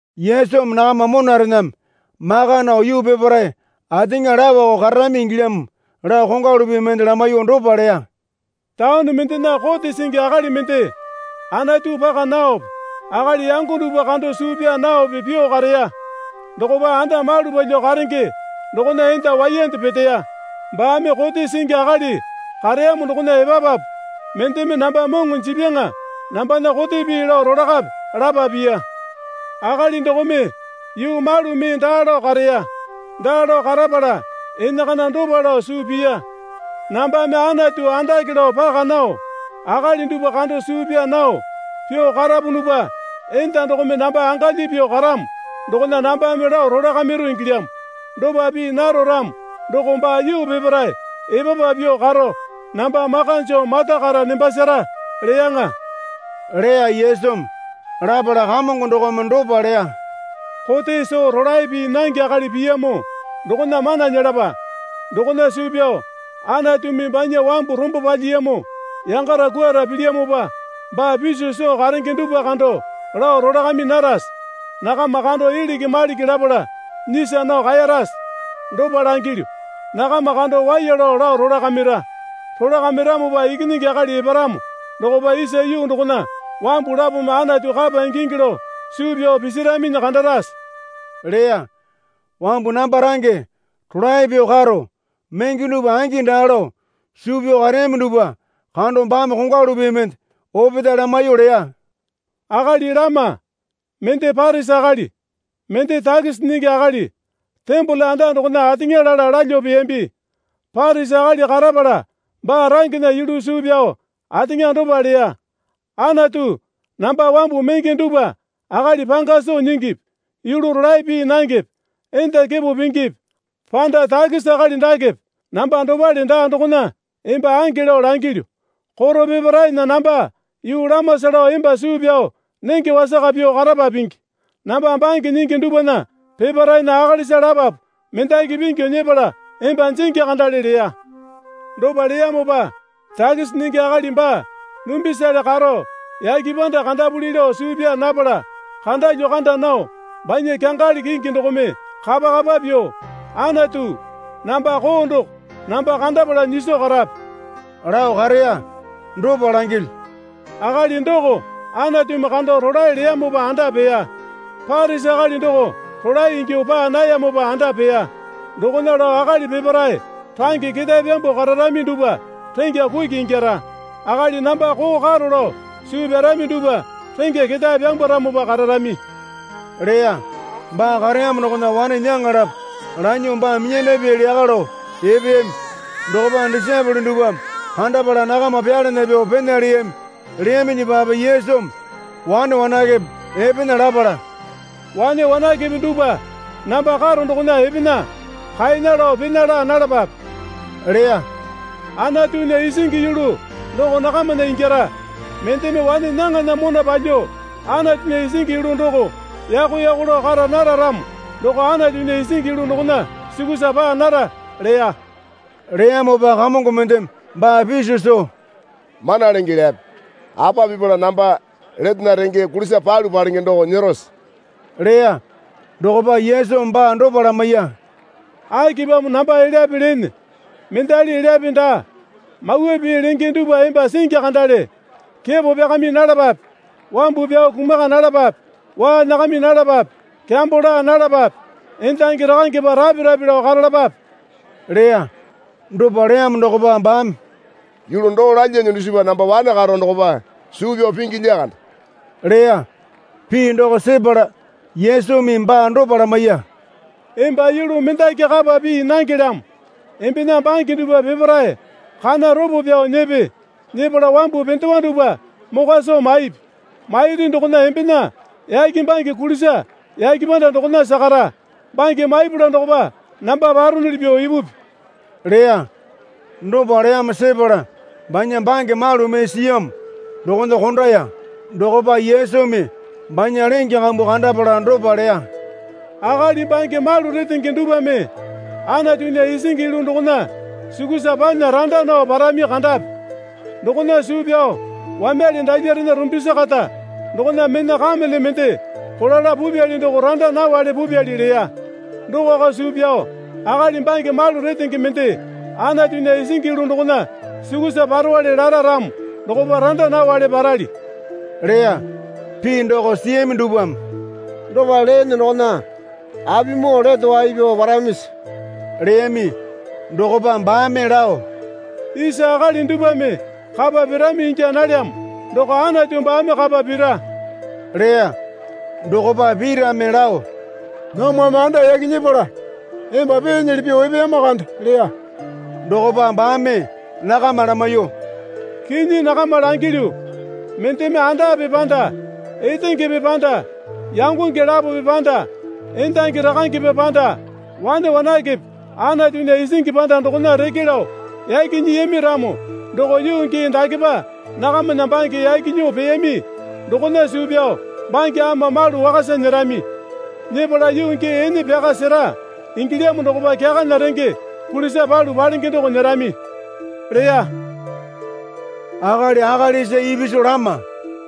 Yesumi nakama monarename maka nao yuu peparae ateŋa laoko kararami ingilyamo lao kongwalu pii mende lamaiyuo dopa leya. Taone mendena kote singi akali mende Anatu paka naope akali yango dupwa kando suu pyaa naope pyuo kareya. Dokopa anda malu palyuo karenge dokona enda waiyande peteya. Baame kote singi akali kareyamo dokona epapapu, Mendeme namba moŋo jipyaŋa nambana kote pii lao rolakape, lapa piya. Akali dokome yuu malu mee daa lao kareya. Daa lao karapala enakana dopa lao suu piya. Nambame Anatu andake lao paka nao, akali dupwa kando suu pyaa nao pyuo karapunupa enda dokome namba angalyi pyuo karamo dokona nambame lao rolakamiru ingilyamo. Dopa pii naro ramo doko baa yuu peparae epapa pyuo karo namba maka joo matakara nembasara, leyaŋa, leya Yesumi. Lapala Kamongo dokome dopa leya. Kote soo rolae pii nange akali piyamo dokona mana nyelapa. Dokona suu pyao Anatumi banya wambu rombo palyiyamo yangala kwuara pilyamopa baa piso soo karenge dupwa kando lao rolakami narase? Nakama kando iliki maliki lapala nyisa nao kaeyarase? Dopa langilyu, nakama kando waiya lao lao rolakamira. Rolakamiramopa Ikinyingi Akali eparamo dokopa isa yuu dokona wambu lapome Anatu kapa ingingi lao suu pyao pisiraminyi kandarase? leya. Wambu namba range rolae pyuo karo menge dupwa angi daa lao suu pyao kareyami dupwa kando baame kongwalu pii mende opetae lamaiyuo leya. Akali lama, mende Parisi akali, mende takisi nyingi akali, tembole anda dokona ateŋa lala lalyuo peyambi. Parisi akali karapala baa rangena yulu suu pyao ateŋa dopa leya. Anatu namba wambu menge dupwa akali panga soo nyingipi yulu rolae pii nangepe enda kepo pingipi panda takisi akali dakepe namba dopale daa dokona emba ange lao langilyu. Koro peparaena namba yuu lamasa lao emba suu pyao nenge wasaka pyuo karapa pingi. Namba bange nyingi dupwana peparaena akalisa lapapu mendaki pingyu nyepala emba jingi kandale leya. Dopa leyamopa takisi nyingi akali baa dumbisale karo yake panda kandapuli lao suu pyaa napala kandalyuo kanda nao banya kyangali kingi dokome kapa kapa pyuo, Anatu, namba koo doko namba kandapala nyiso karape, lao kareya. Dopa langilyu, akali doko Anatumi kando rolae leyamopa anda peya. Parisi akali doko rolae ingyuo paa nayamopa anda peya. Dokona lao akali peparae range ketae pyambuo kararami dupwa rengya kuki ingyara. Akali namba koo karo lao suu pyarami dupwa rengya ketae pyambwaramopa kararami, leya. Baa kareyamo dokona wane nyaŋa lapo lanyuo baa minyandapyali yaka lao epeyami. Dokopa disaepole dupwame kandapala nakama pyalana pyuo pena leyami. Leyaminyipape Yesumi wane wanakepe epena lapala, Wane wanakepe dupwa namba karo dokona epena. Kaena lao pena laa nalapape, leya. Anatunya isingi yulu doko nakamana ingyara. Mendeme wane nyaŋana mona palyuo Anatunya isingi yulu doko yako yako lao kara nara ramo doko Anatunya isingi yulu dokona sukusa paa nara, leya. Leyamopa kamongo mendeme baa piso soo, Mana Lenge elyape, apa pipala namba letena renge kulisa palu palenge doko nyerose? leya. Dokopa Yesumi baa dopa lamaiya. Akipamo namba elyape leene? Mendali elyape daa. Mawa pii lenge dupwa emba singi kandale. Kepo pyakami nalapape. Wambu pyao kumaka nalapape. Waa nyakami nalapape. Kyambo laa nalapape. Endangi rakangepa rape rape lao karalapape leya. Dopa leyamo dokopa baame, Yulu doo lalyane dusipa namba wane karo dokopa suu pyao pingi lyakande leya. Pii doko sepala Yesumi baa dopa lamaiya. Emba yulu mendaki kapa pii nangelyamo. Embena bange dupwa peparae kana ropo pyao nyepe. Nyepala wambu pendewa dupwa mokwa soo maipi. Mairi dokona embena yake bange kulisa yake panda dokona sakara. Bange maipala dokopa namba paronuli pyuo ipupi, leya. Dopa leyamo sepala banya bange malu mee siyamo dokona kondaya. Dokopa Yesumi banya lenge kambu kandapala dopa leya. Akali bange malu retenge dupwame Anatunya isingi yulu dokona sukusa panya randa nao parami kandapi. Dokona suu pyao wamyale dalyarena rumbisi kata dokona mena kamele mende kolala pupyali doko randa nawale pupyali leya. Dokako suu pyao akali bange malu retenge mende Anatunya isingi yulu dokona sukusa parowale lara ramo dokopa randa nawale parali, leya. Pii doko siyami dupwame, Dopa leene dokona apimoo lete wai pyao paramisi? leyami. Dokopa baame lao, Isa akali dupwame kapa pirami ingya nalyamo doko Anatu baame kapa pira, leya. Dokopa Pitame lao, Namwame anda yaki nyepala emba peenyili pyuo epeyama kande, leya. Dokopa baame nakama lamaiyuo, Kinyi nakama langilyu. Mendeme andape panda etengepe panda yangonge lapope panda endangi rakangepa panda wane wanakepe Anatunya isingi panda dokona reke lao yaki nyiyami ramo doko yuu gii dakepa nakamana bange yaki nyuo peyami dokona suu pyao bange ama malu wakasa nyerami. Nyepala yuu gii ene pyaka sera ingilyamo dokopa kyakana renge kulisa palu palenge doko nyerami leya. Akali akalisa ipisu lama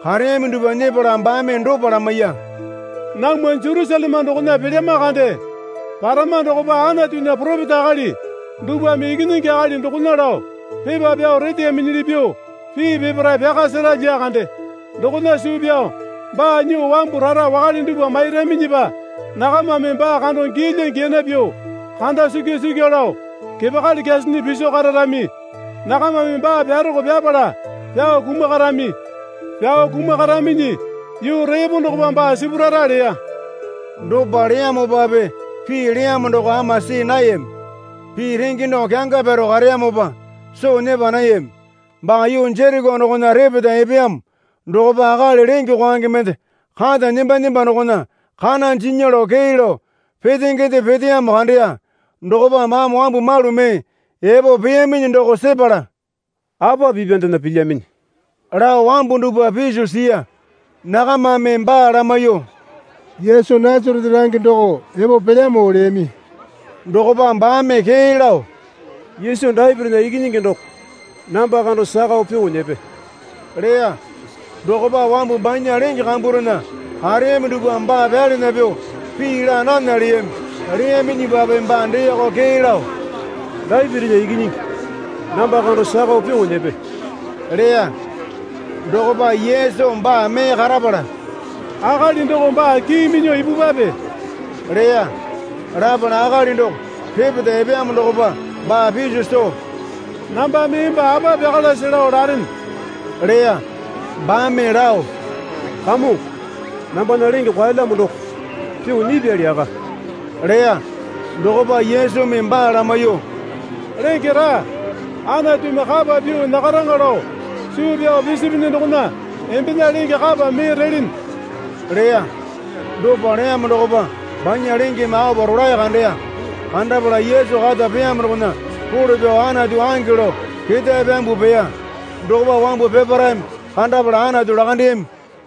kareyami dupwa nyepala baame dopa lamaiya. Namwa Jerusaleme dokona pelyama kande. Parama dokopa Anatunya poropeta akali dupwame Ikinyingi Akali dokona lao pepa pyao reteyaminyili pyuo pii peparae pyaka sera lyakande. Dokona suu pyao baa nyuo wambu rara wakale dupwa mairaminyipa nakamame baa kando giyalya giyana pyuo kanda sikya sikyu lao kepakali kyasinyi piso kararami. Nakamame baa pyaroko pyapala pyao kumakarami. Pyao kumakaraminyi yuu repo dokopa baa sipurara leya. Dopa leyamopape pii leyamo doko ama see nayami. Pii renge doko kyanga pyaro kareyamopa soo nyepa nayami. Baa yuu Jereko dokona repeta epeyamo dokopa akali lenge kwaenge mende kata nemba nemba dokona kana jinya lao kee lao petengende peteyamo kandeya. Dokopa baame wambu malu mee epo peyaminyi doko sepala, Apa pipyandena pilyaminyi? lao wambu dupwa piso siya. Nakamame baa lamaiyuo, Yesu Nasarete range doko epo pelyamo leyami. Dokopa baame kee lao, Yesu Dapitinya Ikinyingi doko, namba kando sakao pyuo nyepe leya. Dokopa wambu banya lenge kamburena kareyami dupwame baa pyalana pyuo pii laa nana leyami. Leyaminyipape baa deeko kee lao, Dapitinya Ikinyingi, namba kando sakao pyuo nyepe leya. Dokopa Yesu baa mee karapala, Akali doko baa kii minyuo ipupwape leya. Lapala akali doko repeta epeyamo dokopa baa piso soo, Nambame emba apa pyakalase lao larene? leya. Baame lao, Kamongo, nambana lenge kwaelyamo doko pyuo nyipyali yaka, leya. Dokopa Yesumi baa lamaiyuo, Lenge raa. Anatumi kapa pyuo nyakaraŋa lao suu pyao pisipinyi dokona embena lenge kapa mee relene leya. Dopa leyamo dokopa banya lengeme aopa rolae kandeya. Kandapala Yesu kata peyamo dokona role pyao Anatu ange lao ketae pyambuo peya. Dokopa wambu peparaeme kandapala Anatu lakandeyami.